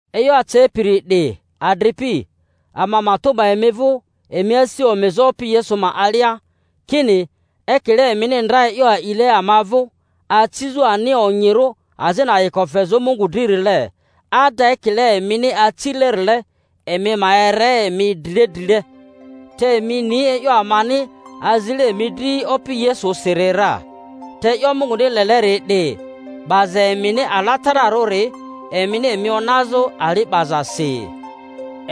E'yo acepiri 'di, adripi, ama matᴜ 'ba emi vᴜ emi asi omizᴜ Opi Yesu ma alia, kini, ekile emini ndra e'yo a'ile ama vᴜ acizᴜ ani onyirᴜ azini ayiko fezᴜ Mungu dririle, ada ekile emini acilerile, emi ma ere emi drile drile. Te emi ni e'yo amani azile emi dri Opi Yesusiri ra. Te e'yo Munguni leleri 'di, 'baza emini alatararᴜri: emini emi onazᴜ ali 'bazasi;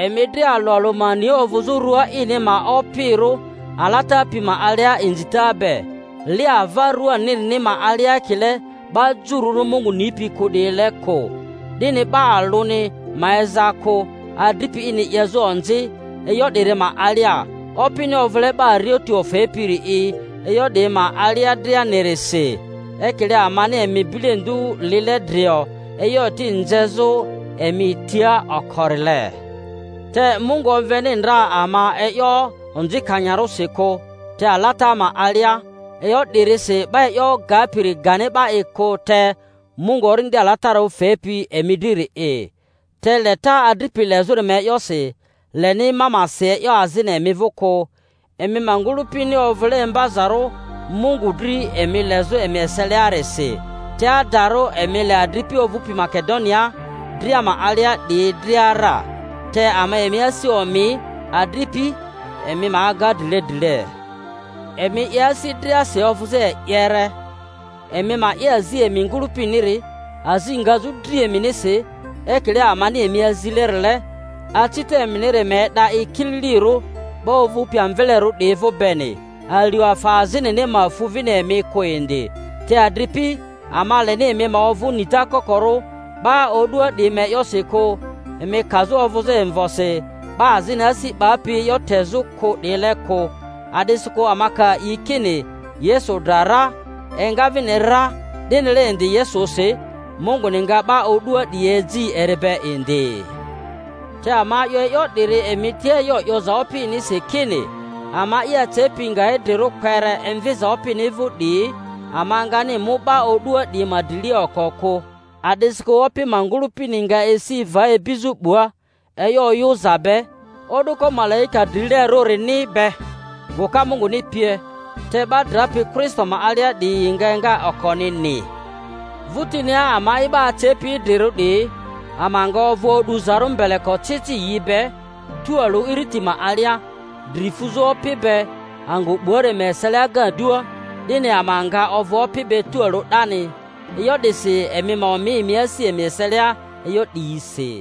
emi dria alᴜ alᴜ ma ni ovᴜzᴜ rᴜa ini ma opirᴜ alata pi ma alia inzita be, li ava ruanirini ma alia ekile 'ba jururᴜ Mungu nipi kᴜ 'diyile kᴜ; 'dini 'ba alᴜni ma eza kᴜ, adripi ini 'yezᴜ onzi e'yo 'diri ma alia, Opini ovᴜle 'ba arioti ofepiri'i e'yo 'diyi ma alia drianirisi, ekile amani emi bilendu lile drio, e'yo eti nzezᴜ emi tia okorile. Te Mungu omveni ndra ama e'yo onzikanyarᴜsi kᴜ, te alata ma alia. E'yo 'dirisi 'ba e'yo gapiri gani 'ba'i kᴜ, te Mungu Orindi Alatararᴜ fepi emi driri'i. Te leta adripi lezᴜri ma e'yosi, leni ma ma si e'yo azini emi vᴜ kᴜ, emi ma ngᴜlᴜpini ovᴜle imbazarᴜ Mungu dri emi lezᴜ emi eseliarisi; te adarᴜ emi le adripi ovᴜpi Makedonia dria ma alia 'diyi dria ra. Te ama emi asi omi, adripi, emi ma aga drile drile, emi 'ye asi driasi ovᴜzᴜ e'yere, emi ma 'ye azi emi ngᴜlᴜpiniri, azi ngazᴜ dri eminisi, ekile amani emi azilerile; acita eminiri ma e'da'i kililirᴜ 'ba ovᴜpi amvelerᴜ 'diyi vᴜ beni, alio afa azinini ma fu vini emi kᴜ indi. Te adripi, ama leni emi ma ovᴜ nita kokorᴜ 'ba o'dua 'diyi ma e'yosi kᴜ, emi kazᴜ ovᴜzᴜ imvosi 'ba azini asi 'bapi e'yo tezᴜ kᴜ 'diyile kᴜ. A'disikᴜ ama ka a'i kini Yesu dra ra, enga vini ra, 'dinile indi Yesusi, Munguni nga 'ba o'dua 'diyi eji eri be indi. Te ama 'yo e'yo 'diri emi tia e'yo 'yoza Opinisi, kini, ama'i acepi nga idrirᴜ kpere emviza Opini vᴜ 'diyi, ama ngani mu 'ba o'dua 'diyi ma drilia oko kᴜ. A'disikᴜ Opi ma ngᴜlᴜpini nga esi va ibizᴜ 'bua, e'yo oyᴜza be, o'duko malaika drilerᴜrini be, guka Munguni pie. Te 'ba drapi Kristo ma alia 'diyi yi nga enga okonini; vᴜtinia ama'i 'ba acepi idrirᴜ 'diyi, ama nga ovᴜ o'duzarᴜ mbele-kocici yi be tualᴜ iriti ma alia, dri fuzᴜ Opi be angᴜ 'buari ma eselia agadua; 'dini ama nga ovᴜ Opi be tualᴜ 'dani. E'yo 'disi emi ma omi emi asi emi eselia e'yo 'diyisi.